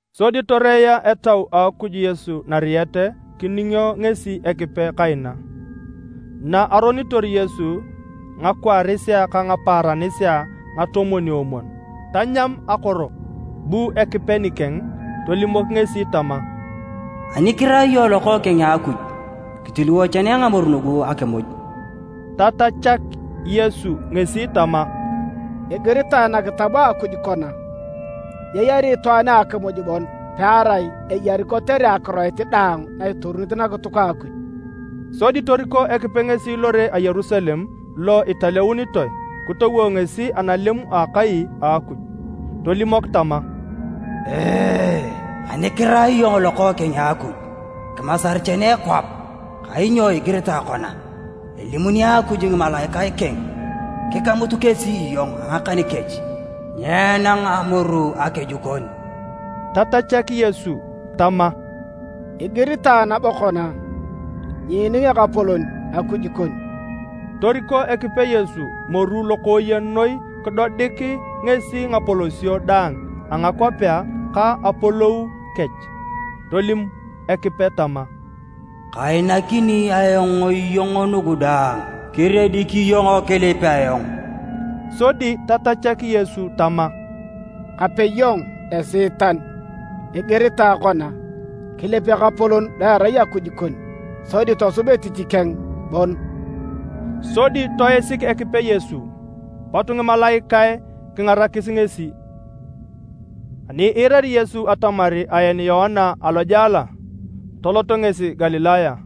Sodi toreea Etau a Akuj Yesu nariet kiningio ngesi Ekipe kaina. Na aronitor Yesu ngakwaarisea ka ngapaaranisea ngatomwon-omwon, tanyam akoro. Bu Ekipe nikeng tolimok ngesi tama, “Ani kirai iyong Lokookeng a Akuj, kitiliwo chene ngamoru nugu akimuj.” Tatachak Yesu ngesi tama, “Igiritae nakitab a Akuj kona: ‘Nyeyari itwaan a akimuj bon pearai eyari kotere akiroit daang na itoruni nakituk a Akuj.’” Sodi toriko Ekipe ngesi Lore a Yerusalem, lo italeunitoe, kitowo ngesi analem a akai a Akuj, tolimok tama, “Ani kirai iyong Lokookeng a Akuj kimasar chene kwap, kainyo igiritae kona: ‘Elimokini Akuj ngimalaikae keng kikamut kesi iyong a ngakan kech, nyeenang amoru akeju kon.’” Tatachak Yesu tama, “Igiritae nabo kona: ‘Nyiining Ekapolon Akuj kon.’” Toriko Ekipe Yesu moru lokooyen noi kidodik ngesi ngapolosio daang a ngakwapea ka apolou kech. Tolim Ekipe tama, “Kainakini ayong iyong nugu daang kiriedik iyong kilip ayong.” Sodi tatachak Yesu tama, “Kape iyong Esiitan. Igiritae kona: ‘Kilip Ekapolon lo erai Akuj kon, sodi tosub etich keng bon!’” Sodi toisik Ekipe Yesu, pot ngimalaikae kingarakis ngesi. Ani iirari Yesu atamar aen Yoana alojela, tolot ngesi Galilaya.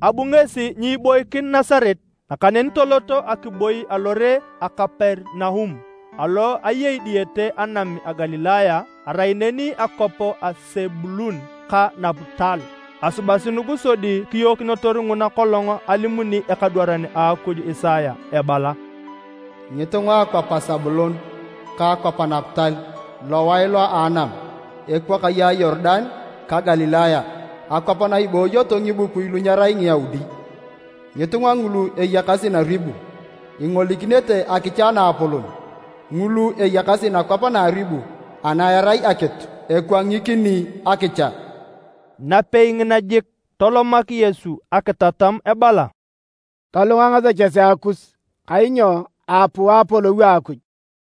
Abu ngesi nyiiboikin Nasaret, nakaneni tolot akiboi alore a Kaperinaum alo eyei diyete anam a Galilaya. Erai neni akwap a Sebulun ka Naputal. Asubasi nugu sodi kiyookinitor nguna kolong alimuni ekadwaran a Akuj Isaya ebala: “Ngitunga a akwap a Sebulun ka akwap a Naputal, lowae lo a anam, ekwakaye a Yorudan, ka Galilaya, akwap na ibooyoto ngibukui lu nyerai Ngiyaudi. Ngitunga ngulu eyakasi naribu, ingolikinete akicha naapolon. Ngulu eyakasi nakwap na aribu ana erai akitu, ekwangikini akicha.” Napei ngina jik, tolomak Yesu akitatam ebala, “Tolunga ngasechesea kus, kainyo aapuu Apolou a Akuj.”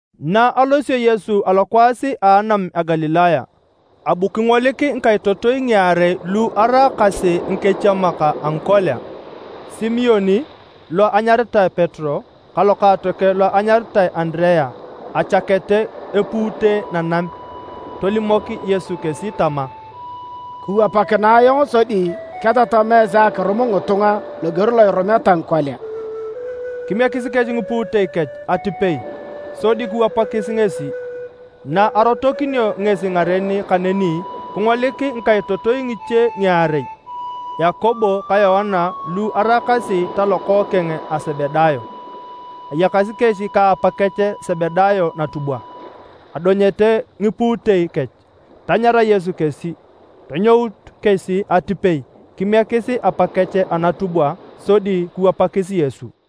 Na alosio Yesu alokwaas a anam a Galilaya, abu kingolik ngikaitotoi ngiarei lu araakasi ngikechiemak a ngikolia, Simon (lo enyaritae Petero) ka lokaatokeng lo anyaritae Andirea, echakete epuute nanam. Tolimok Yesu kesi tama, “Kiwapakinae ayong sodi ketatam esi akirum ngitunga loger lo irumeta ngikolia.” Kimiekis kesi ngipuutei kech atipei sodi kiwapakis ngesi. Na arotokinio ngesi ngaren kaneni, kingolik ngikaitotoi ngiche ngiarei, Yakobo ka Yoana lu eraakasi talokookeng a Sebedayo. Ayakasi kesi ka apakech Sebedayo natubwa edonyete ngipuutei kech. Tanyara Yesu kesi. Tonyout kesi atipei kimiekis apakech anatubwa sodi kiwapakis Yesu.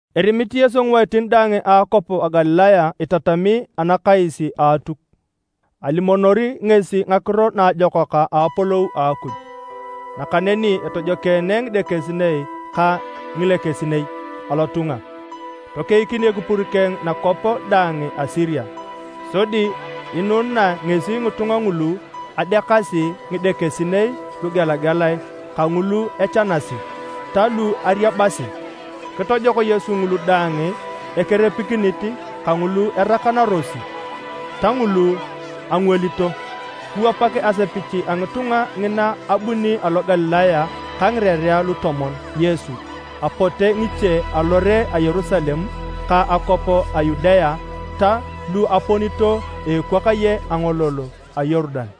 Erimit Yesu ngiwaitin daang a akwap a Galilaya itatami anakais a Atuk. Alimonori ngesi Ngakiro Naajokak a Apolou a Akuj, nakaneni etojokeene ngidekesinei ka ngilekesinei alotunga. Tokeikin ekipur keng nakwap daang a Siria. Sodi inunae ngesi ngitunga ngulu adeakasi ngidekesinei lugelagelae kangulu echanasi, ta lu ariabasi. Kitojok Yesu ngulu daang ekerepikinit, kangulu erakanarosi, ta ngulu angwalito. Kiwapak asepich a ngitunga ngina abuni alo Galilaya ka ngirerea Lutomon, Yesu. Apote ngiche alore a Yerusalem, ka akwap a Yudea ta lu aponito a ekwakaye angolol a Yorudan.